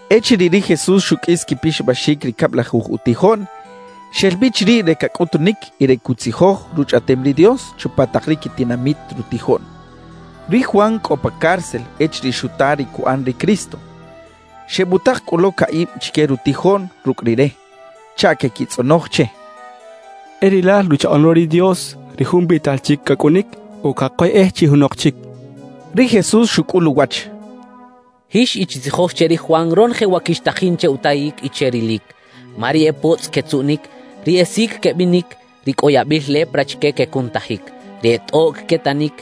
Echiriꞌ ri Jesús xuqꞌuis quipixabaxic ri cablajuj utijoꞌn, xel bi chiriꞌ re cacꞌutunic y re cutzijoj Ruchꞌaꞌtem ri Dios chupa tak ri quitinamit rutijoꞌn. Ri Juan cꞌo pa cárcel echiriꞌ xuta ri cuꞌan ri Cristo. Xebutak cꞌu lo caꞌib chique rutijoꞌn rucꞌ Rire, chaꞌ queꞌquitzꞌonoj che: —¿E rilal Ruchaꞌoꞌn lo ri Dios, ri Jun biꞌtal chic cacꞌunic, o cakoyꞌej chi junok chic? —xechaꞌ. Ri Jesús xucꞌul uwach: —Jix y chitzijoj che ri Juan ronoje wa quixtajin che utayic y che rilic. Ma ri e potzꞌ quetzuꞌnic, ri e sic quebinic, ri cꞌo yabil lepra chique quecunutajic, ri e tꞌoꞌc quetanic,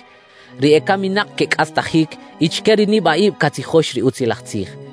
ri ecaminak quecꞌastajic y chique ri nibaꞌib catzijox ri Utzilaj Tzij.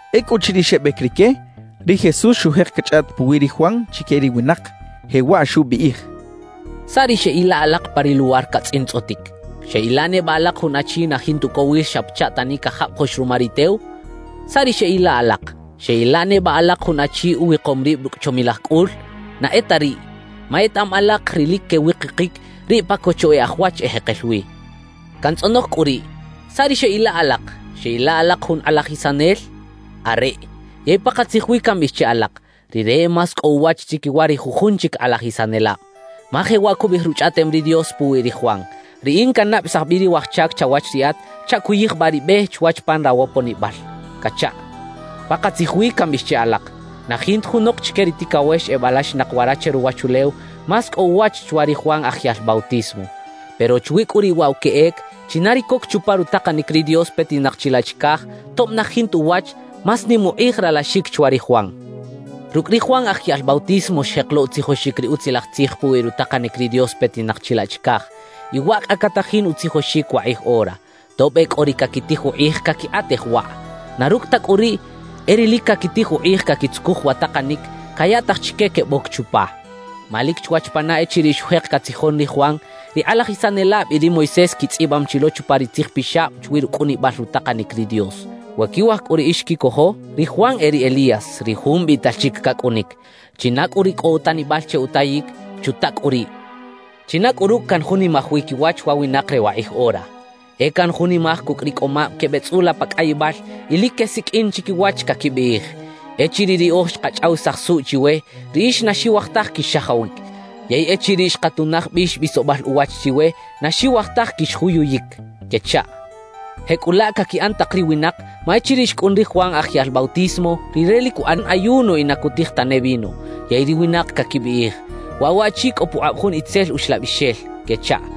Ecꞌuchiriꞌ xebec rique, ri Jesús xujek cachꞌaꞌt puwi ri Juan chique ri winak, jewaꞌ xubiꞌij: «¿Saꞌ ri xeꞌila alak pa ri luwar catzꞌintzꞌotic? ¿Xeꞌila neba alak jun achi na jinta ucowil xa pachaꞌ tani cajabajoꞌx ruma ri tew? ¿Saꞌ ri xeꞌila alak? ¿Xeꞌila neba alak jun achi uwikom rib rucꞌ chomilaj cꞌul? Na e ta riꞌ, ma etaꞌam alak ri lic quewikikic, riꞌ pa cocho e aj wach ejekel wi. Cantzꞌonoj cꞌu riꞌ: ¿Saꞌ ri xeꞌila alak? ¿Xeꞌila alak jun kꞌalajisanel? Areꞌ, yey pakatzij wi cambiꞌij che alak: Rire e más cꞌo uwach chiquiwa ri jujun chic kꞌalajisanelab. Ma jewaꞌ cubiꞌij Ruchꞌaꞌtem ri Dios puwi ri Juan: Riꞌin cannabesaj bi ri waj chac chawach Riꞌat chaꞌ cuyijbaꞌ ri be chwach pan rawoponibal cachaꞌ. »Pakatzij wi cambiꞌij che alak: Na jinta junok chique ri ticawex ebalaxinak wara che ruwachulew más cꞌo uwach chwa ri Juan Aj Yaꞌl Bautismo. Pero chwi cꞌu riꞌ waꞌ wa queꞌec, china ri coc chupa rutakanic ri Dios petinak chilaꞌ chicaj, tob na jinta uwach, más nim ukꞌij ralaxic chwa ri Juan. »Rucꞌ ri Juan Aj Yaꞌl Bautismo xjek lo utzijoxic ri Utzilaj Tzij puwi rutakanic ri Dios petinak chilaꞌ chicaj, y waꞌ cꞌa catajin utzijoxic wakꞌij ora, tob e cꞌo ri caquitij ukꞌij caquikꞌatej waꞌ. Na rucꞌ ta cꞌu riꞌ, e ri lic caquitij ukꞌij caquitzucuj wa takanic, cayaꞌtaj chique queboc chupa. Ma lic chwach pana echiriꞌ xujek catzijon ri Juan, ri kꞌalajisanelab y ri Moisés quitzꞌibam chi lo chupa ri Tzij Pixab chwi rucꞌunibal rutakanic ri Dios. We quiwaj cꞌu riꞌix quicojo, ri Juan e ri Elías, ri jun biꞌtal chic cacꞌunic. China cꞌu ri cꞌo utanibal che utayic, ¡chuta cꞌu riꞌ! »¿China cꞌu rucꞌ canjunimaj wi quiwach wa winak re wakꞌij ora? E canjunimaj cucꞌ ri cꞌoꞌmab quebeꞌtzꞌula pa cꞌayibal y lic quesiqꞌuin chiquiwach, caquibiꞌij: Echiriꞌ riꞌoj xkachꞌawisaj suꞌ chiwe, riꞌix na xiwaj taj quix-xajawic; yey echiriꞌ xkatunaj bix bisobal uwach chiwe, na xiwaj taj quixjuyuyic quechaꞌ. »Jecꞌulaꞌ caquiꞌan tak ri winak, ma echiriꞌ xcꞌun ri Juan Aj Yaꞌl Bautismo, rire lic cuꞌan ayuno y na cutij tane vino. Yey ri winak caquibiꞌij: “Waꞌ waꞌchi cꞌo pukꞌab jun itzel uxlabixel” quechaꞌ.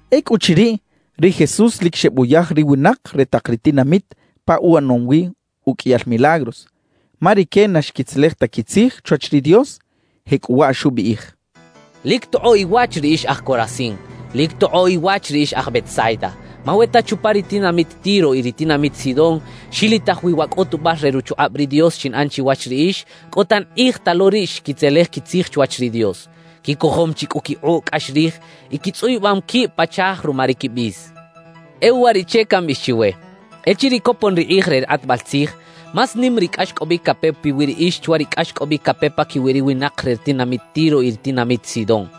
Ecꞌuchiriꞌ, ri Jesús lic xebuyaj ri winak re tak ri tinamit pa uꞌanom wi uqꞌuiyal milagros, ma rique na xquitzelej ta quitzij chwach ri Dios. Jecꞌuwaꞌ xubiꞌij: «¡Lic tokꞌoꞌ iwach ri ix aj Corazín! ¡Lic tokꞌoꞌ iwach ri ix aj Betsaida! Ma we ta chupa ri tinamit Tiro y ri tinamit Sidón xilitaj wi wa cꞌutubal re ruchukꞌab ri Dios xinꞌan chiwach riꞌix, cꞌo tan kꞌij ta lo riꞌ xquitzelej quitzij chwach ri Dios, quicojom chi cꞌu quikꞌuꞌ cꞌax rij y quitzꞌuyubam quib pa chaaj ruma ri quibis. E uwariꞌche cambiꞌij chiwe: Echiriꞌ copon ri kꞌij re ri kꞌatbal tzij, más nim ri cꞌaxcꞌobic cape piwi riꞌix chwa ri cꞌaxcꞌobic cape paquiwi ri winak re ri tinamit Tiro y ri tinamit Sidón.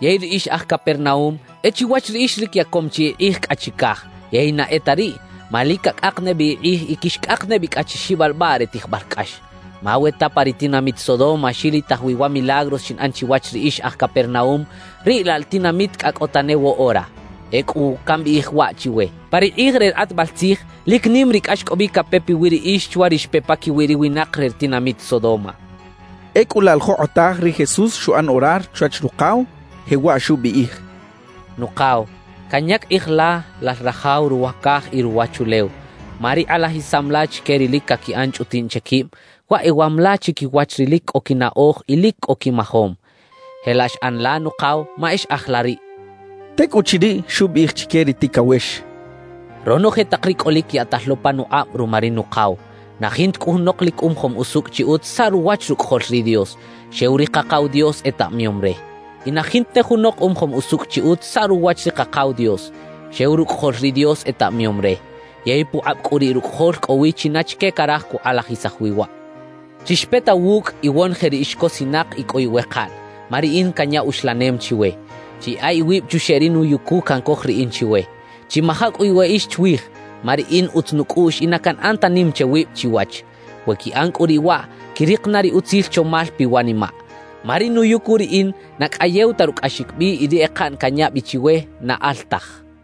»Yey ri ix aj Capernaúm, e chiwach riꞌix lic yacom chi ikꞌij cꞌa chicaj; yey na e ta riꞌ, ma lic cacꞌak ne bi ikꞌij y quixcꞌak ne bi cꞌa chi xibalbaꞌ re tijbal cꞌax. Ma we ta pa ri tinamit Sodoma xilitaj wi wa milagros xinꞌan chiwach riꞌix ix aj Capernaúm, riꞌ laꞌ la tinamit cꞌa cꞌo tane woꞌora. Ecꞌu cambiꞌij waꞌ chiwe: Pa ri kꞌij re ri kꞌatbal tzij, lic nim ri cꞌaxcꞌobic cape piwi riꞌix chwa ri xpe paquiwi ri winak re ri tinamit Sodoma» xchaꞌ. Ecꞌu laꞌ la jokꞌotaj ri Jesús xuꞌan orar chwach Rukaw, jewaꞌ xubiꞌij: «Nukaw, canyac kꞌij la, Lal Rajaw ruwa caj y ruwachulew, ma ri kꞌalajisam la chique ri lic caquiꞌan chꞌutiꞌn che quib, waꞌ ewam la chiquiwach ri lic cꞌo quinaꞌoj y lic cꞌo quimajom. Jelaꞌ xꞌan la, Nukaw, ma e xꞌaj la riꞌ» xchaꞌ. Tecꞌuchiriꞌ, xubiꞌij chique ri ticawex: «Ronoje tak ri cꞌolic yaꞌtal lo panukꞌab ruma ri Nukaw. Na jinta cꞌu junok lic umajom usucꞌ chi utz saꞌ ruwach Rucꞌajol ri Dios, xew ri Kakaw Dios etaꞌmayom re. Y na jinta ne junok umajom usucꞌ chi utz saꞌ ruwach ri Kakaw Dios, xew Rucꞌajol ri Dios etaꞌmayom re; yey pukꞌab cꞌu riꞌ Rucꞌajol cꞌo wi china chique caraj cukꞌalajisaj wi waꞌ. »Chixpeta wucꞌ, iwonoje ri ix cosinak y cꞌo iwekaꞌn, ma riꞌin canya uxlanem chiwe. Chiyaꞌa iwib chuxeꞌ ri nuyucu cancoj riꞌin chiwe. Chimaja cꞌu iweꞌix chwij, ma riꞌin utz nucꞌuꞌx y na canꞌan ta nim che wib chiwach. We quiꞌan cꞌu riꞌ waꞌ, quirik na ri utzil chomal piwanimaꞌ. Ma ri nuyucu riꞌin, na cꞌayew ta rucꞌaxic bi y ri ekaꞌn canya bi chiwe na al taj» xchaꞌ.